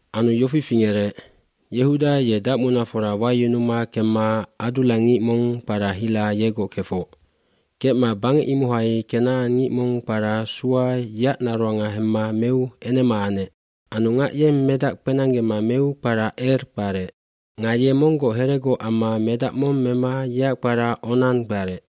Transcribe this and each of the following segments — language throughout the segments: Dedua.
Anu yofi fingerec, Yehuda ye dacmunafora wayunuma kemma adullangngic mong kpara Hira yegoc kefoc. Kecma bangec imohai kenacangngic mong kpara Sua yeac naroanga hemma meu enema anec. aAnu ngac yeng medac kpenanggema meu kpara Er kparec. Nga ye monggoc heregoc amma medac mong mema yeac kpara Onan kparec.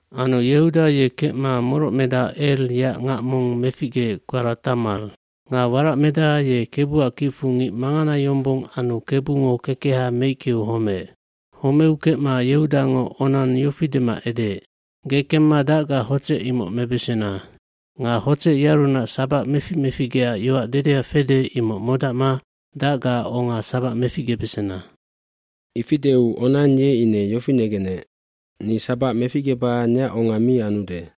Anu Yehuda ye kecma morocmedaha Er yeac ngac mong meficgeec kpara Tamar. Nga waracmedac ye Kebuac kicfu ngic mangana yombong anu Kebungo kekeha meickeu homeec. bHomeu kecma Yehudango Onan yofi dema edeec, “Ge kemma dacgaac hotsec imoc mebesena. Nga hotsec yearunac sabac mefic meficgeac yoac dedea fede imoc modacma dacgaac onga sabac meficgebesena.” Ifi deu Onan ye ine yofi negenec ni sabac meficgeba neac onga mi anude.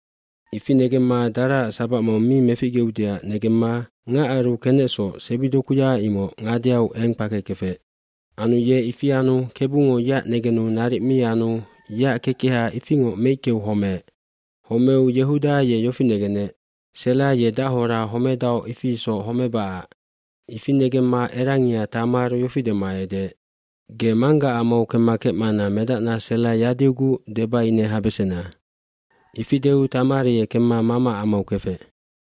Ifi negemma daraac sabac mong mi meficgeudeac negemma ngacaru kenecsoc sebidokuya imoc ngadeau eng kpakekefec. Anu ye ifi anu Kebungo yeac negenu naric mi anu yeac kekeha ifingoc meickeu homeec. Homeu Yehuda ye yofi negenec, “Sela ye dachora homedaoc ifi isoc homebacac.” Ifi negemma erangia Tamar yofi dema edeec, “Ge manggaac amau kemma kecmana medacna Sela yadiuguc deba ine habesena.” Ifi deu Tamar ye kemma mamaac amau kefec.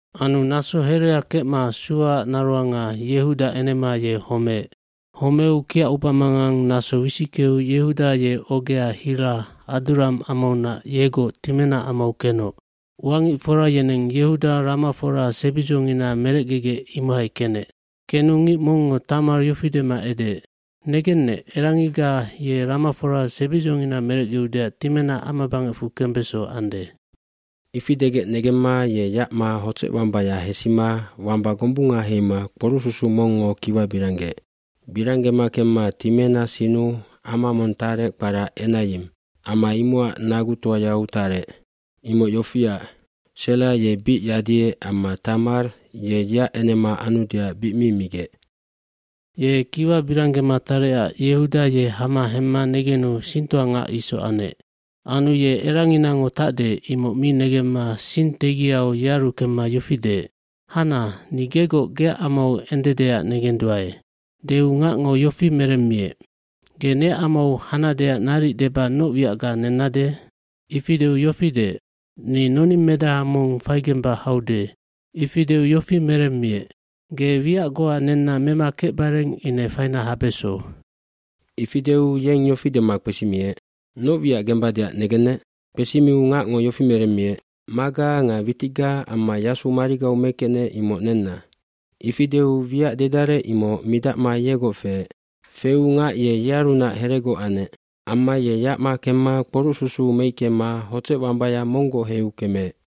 Anu naso herea kecma Suaac naroanga, Yehuda enema ye homeec. Homeu kiac ubamanganggac naso wisickeu Yehuda ye ogea Hira, Adullam amaunac yegoc Timena amau kenoc. Uangicfora yeneng Yehuda ramafora sebidzongina merecgegec imohai kenec. Kenu ngic mongngo Tamar yofi dema edegec, “Negennec, erangiga ye ramafora sebidzongina merecgeudeac Timena amabangecfu kembeso ande.” Ifi degec negemma ye yacma hotsecwambaya hesima wamba gombunga heima kporucsusuc mongngo kiwa biranggeec. Biranggema kemma Timena sinnu ama mong tarec kpara Enayim, ama imocac nagutoayau tarec. Imoc yofiac, Sela ye bic yadiec amma Tamar ye yeac enema anudeac bic mi migec. cYe kiwa biranggema tarecac Yehuda ye hama hemma negenu singtoangac isoc anec. dAnu ye eranginango tacde imoc mi negemma sing tegiau yearu kemma yofi deec, “Hana, ni gegoc geac amau endedeac negenduae.” Deu ngacngo yofi meremmiec, “Ge neac amau hanadeac naric deba noc wiacga nennade?” Ifi deu yofi deec, “Ni noningmedaha mong faigemba haude.” Ifi deu yofi meremmiec, “Ge wiac goa nenna mema kecbareng ine faina habeso.” Ifi deu yeng yofi dema kpesimiec, “Noc wiac gembadeac negennec?” Kpesimiu ngacngo yofi meremmiec, “Maga nga witicga amma yasu marigau mekecnec imoc nenna.” Ifi deu wiac dedarec imoc midacma yegoc feec. Feu ngac ye yearunac heregoc anec. Amma ye yacma kemma kporucsusuc meickema hotsecwambaya monggoc heiu kemeec.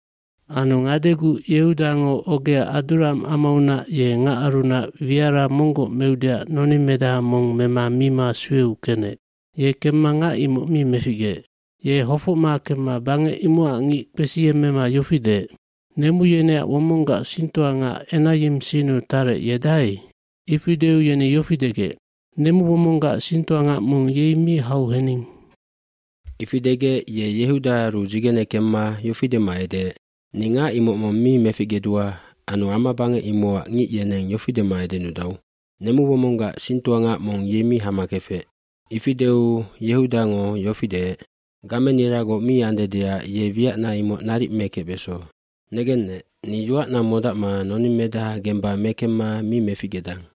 Anu ngadeguc Yehudango ogea Adullam amaunac ye ngacarunac wiara monggoc meudeac noningmedaha mong mema mima sueu kenec. Ye kemma ngac imoc mi meficgeec. Ye hofocma kemma bangec imocac ngic kpesiyemmema yofi deec, “Nemu yeneac womonggac singtoangac Enayim sinnu tarec ye dahai?” Ifi deu yeni yofi degec, “Nemuwomonggac singtoangac mong yei mi hau hening.” Ifi degec ye Yehudaaru dzigene kemma yofi dema edeec, “Ni ngac imoc mong mi meficgedua anu amabangec imocac ngic yeneng yofi dema edenudau, ‘Nemuwomonggac singtoangac mong yei mi hama kefec.’” Ifi deu Yehudango yofi deec, “Gameniragoc mi andedeac ye wiacna imoc naric mekecbeso. Negennec, ni yoacna modacma noningmedaha gemba mekemma mi meficgedang.”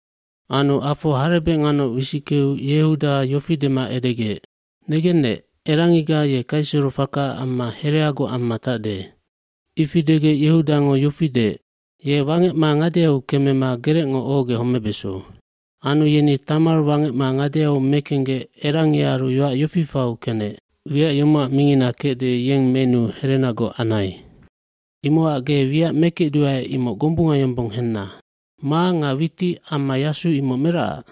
Anu afo harebec nganoc wisickeu Yehuda yofi dema edegec, “Negennec, erangiga ye kaiserofaka amma hereagoc amma tacde.” Ifi degec Yehudango yofi deec, “Ye wangecma ngadeu kemema gerecngo ohogec homebeso.” Anu yeni Tama wangecma ngadeau mekenggec erangiaru yoac yofi fau kenec, “Wiac yomocac mingina kecde yeng menuu herenagoc anai. Imocac ge wiac mekecduae imoc gombunga yombong henna. Ma nga witic amma yasu imoc meracac?”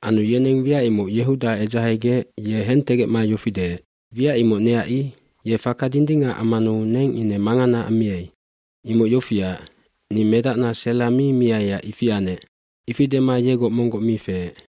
Anu yeneng wiac imoc Yehuda edzahegec ye hentegecma yofi deec, “Wiac imoc neac i. Ye faka dindingac ammanu neng ine mangana ammiai. Imoc yofiac, ni medacna Sela mi miaiac ifi anec.” Ifi dema yegoc monggoc mi feec.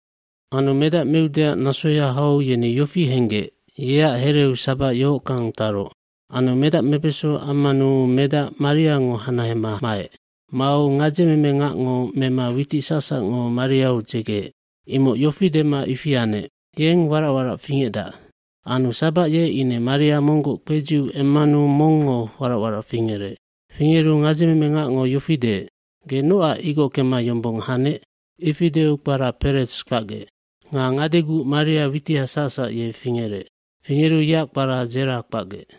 eAnu medac meudeac nasoya hau yeni yofi henggec yeac hereu sabac yohockang taroc. Anu medac mebeso ammanu medac mariango hanahema maec. Mau gadzememengacngo mema witic sacsacngo mariau dzegeec. Imoc yofi dema ifi anec, “Yeng warac warac fingecdac.” Anu sabac ye ine maria monggoc kpedziu emmanu mongngo warac warac fingerec. Fingeru gadzememengacngo yofi deec, “Ge nocac igockema yombong hanec?” Ifi deu kpara Peretsf kpacgec. Nga ngadeguc maria witiha sacsac ye fingerec. Fingeru yeac kpara Dzerag kpacgec.